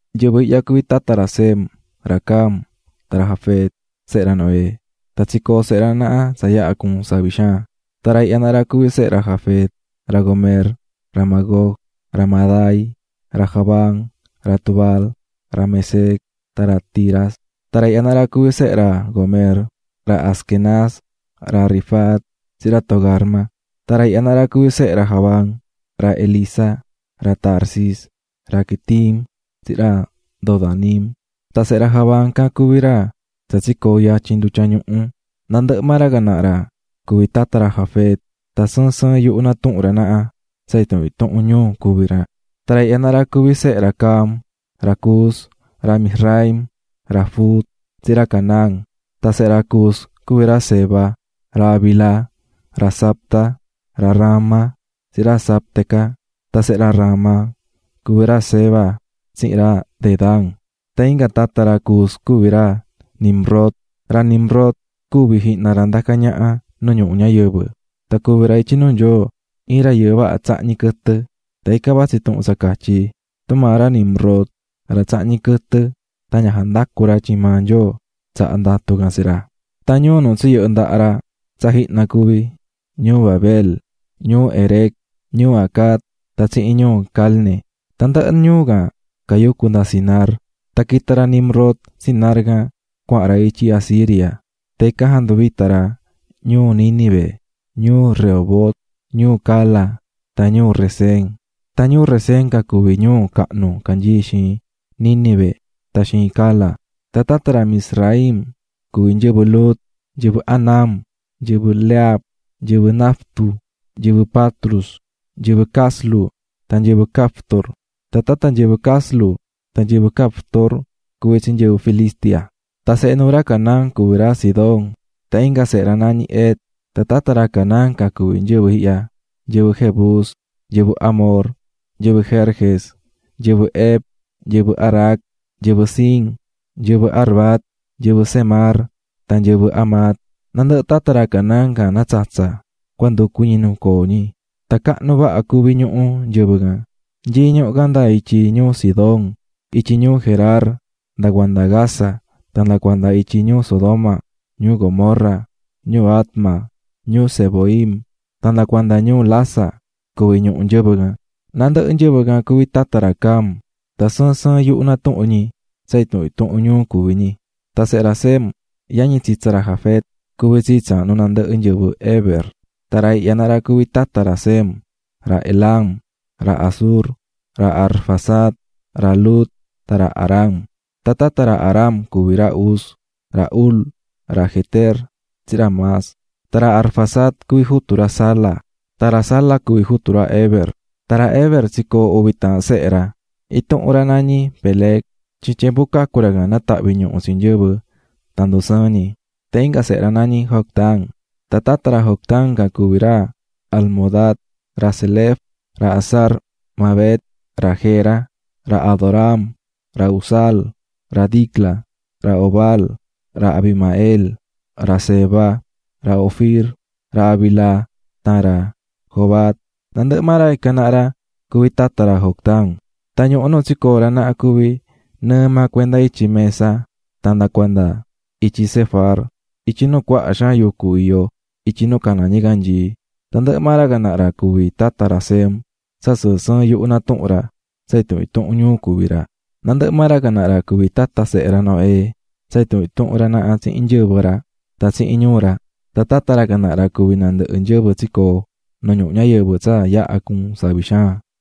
Nyɨvɨ ihya cuví tata sehe ra Sem, ra Cam, tan ra Jafet, sehe ra Noé. Tan tsicoo̱ sehe ra naha tsa yaha cuu̱n savi xaan. Tan ra ihya naha ra cuví sehe ra Jafet: ra Gomer, ra Magog, ra Madai, ra Javán, ra Tubal, ra Mesec tan ra Tiras. Tan ra ihya naha ra cuví sehe ra Gomer: ra Askenaz, ra Rifat, tsihin ra Togarma. Tan ra ihya naha ra cuví sehe ra Javán: ra Elisa, ra Tarsis, ra Quitim tsihin ra Dodanim. Tan sehe ra Javán can cuví ra tsa tsicoo̱ yatyin ndutya ñuhu. Nandɨhɨ maa ra can naha ra cuví tata ra Jafet. Tan sɨɨn sɨɨn yuhu natuhún ra naha, tsa intuhun intuhun ñuu cuví ra. Tan ra ihya naha ra cuví sehe ra Cam: ra Cus, ra Mizraim, ra Fut, tsihin ra Canaán. Tan sehe ra Cus cuví ra Seba, ra Havila, ra Sabta, ra Raama tsihin ra Sabteca. Tan sehe ra Raama cuví ra Xeba tsihin ra Dedán. Tan inga tata ra Cus cuví ra Nimrod, ra Nimrod cuvi̱ jihna ra ndacá ñaha nu ñuhu ñayɨvɨ. Tan cuvi̱ ra ityi nuu Nyoo iin rayɨɨ vaha tsahñí quɨtɨ. Tan ican vatsí tuhun tsa catyí: "Tumaa ra Nimrod, ra tsahñí quɨtɨ tan ña jandacú ra tyin maa Nyoo tsaha̱ ndatu can tsi ra." Tan ñuu nu tsiyɨhɨ̱ ndaha ra tsa jihna cuví: ñuu Babel, ñuu Erec, ñuu Acad, tan tsihin ñuu Calne. Tandɨhɨ ñuu can cayucú nda Sinar. Tan quita̱ ra Nimrod Sinar can cuahan ra ityi Asiria, tan ican janduvita̱ ra ñuu Nínive, ñuu Rehobot, ñuu Cala, tan ñuu Resén; tan ñuu Resén can cuví ñuu cahnu canyií xiin Nínive tan xiin Cala. Tan tata ra Mizraim, cuví nyɨvɨ Lud, nyɨvɨ Anam, nyɨvɨ Lehab, nyɨvɨ Naftu, nyɨvɨ Patrus, nyɨvɨ Caslu, tan nyɨvɨ Caftor. Tan tata nyɨvɨ Caslu tan nyɨvɨ Caftor cuví tsi nyɨvɨ Filistia. Tan sehe nuu ra Canaán cuví ra Sidón tan inga sehe ra nañí Het. Tan tata ra Canaán can cuví nyɨvɨ ihya: nyɨvɨ Jebus, nyɨvɨ Amor, nyɨvɨ Gerges, nyɨvɨ Hev, nyɨvɨ Arac, nyɨvɨ Sin, nyɨvɨ Arvad, nyɨvɨ Zemar, tan nyɨvɨ Hamat. Nandɨhɨ tata ra Canaán can natsatsa̱ cua nducu ñi nu coo ñi. Tan cahnu vaha cuví ñuhu nyɨvɨ can, nyií ñuhu can nda ityi ñuu Sidón, ityi ñuu Gerar, nda cuanda Gaza; tan nda cuanda ityi ñuu Sodoma, ñuu Gomorra, ñuu Adma, ñuu Zeboim, tan nda cuanda ñuu Lasa, cuví ñuhu nyɨvɨ can. Nandɨhɨ nyɨvɨ can cuví tata ra Cam, tsa sɨɨn sɨɨn yuhu natuhún ñi tsa intuhun intuhun ñuu cuví ñi. Tan ra Sem yañi tsitsa ra Jafet, cuví tsii tsaahnu nandɨhɨ nyɨvɨ ra Heber. Tan ra ihya naha ra cuví tata ra Sem: ra Elam, ra Asur, ra Arfaxad, ra Lud tan ra Aram. Tan tata ra Aram cuví ra Uz, ra Hul, ra Geter, tsihin ra Mas. Tan ra Arfaxad cuví jutu ra Sala, tan ra Sala cuví jutu ra Heber. Tan ra Heber tsicoo̱ uvi taahan sehe ra. Intuhun ra nañí Peleg, tyin tyembu cacu̱ ra can natahvi̱ ñuhu tsi nyɨvɨ tan ndusɨɨ̱n ñi. Tan inga sehe ra nañí Joctán. Tan tata ra Joctán can cuví ra Almodad, ra Selef, ra Hazar-mavet, ra Jera, ra Adoram, ra Uzal, ra Dicla, ra Obal, ra Abimael, ra Seba, ra Ofir, ra Havila tan ra Jobab; nandɨhɨ maa ra ican naha ra cuví tata ra Joctán. Tan ñuhu nu tsicoo̱ ra naha cuví nɨɨ maa cuenda ityi Mesa tan nda cuanda ityi Sefar, ityi nu cuaha xaan yucu iyó ityi nu caná ñicanyii. Tandɨhɨ maa ra can naha ra cuví tata ra Sem, tsa sɨɨn sɨɨn yuhu natuhún ra, tsa intuhun intuhun ñuu cuví ra. Nandɨhɨ maa ra can naha ra cuví tata sehe ra Noé tsa intuhun intuhun ra tsihin nyɨvɨ ra, tan tsihin ñuu ra. Tan tata ra can naha ra cuví nandɨhɨ nyɨvɨ tsicoo̱ nu ñuhu ñayɨvɨ tsa yaha cuu̱n savi xaan.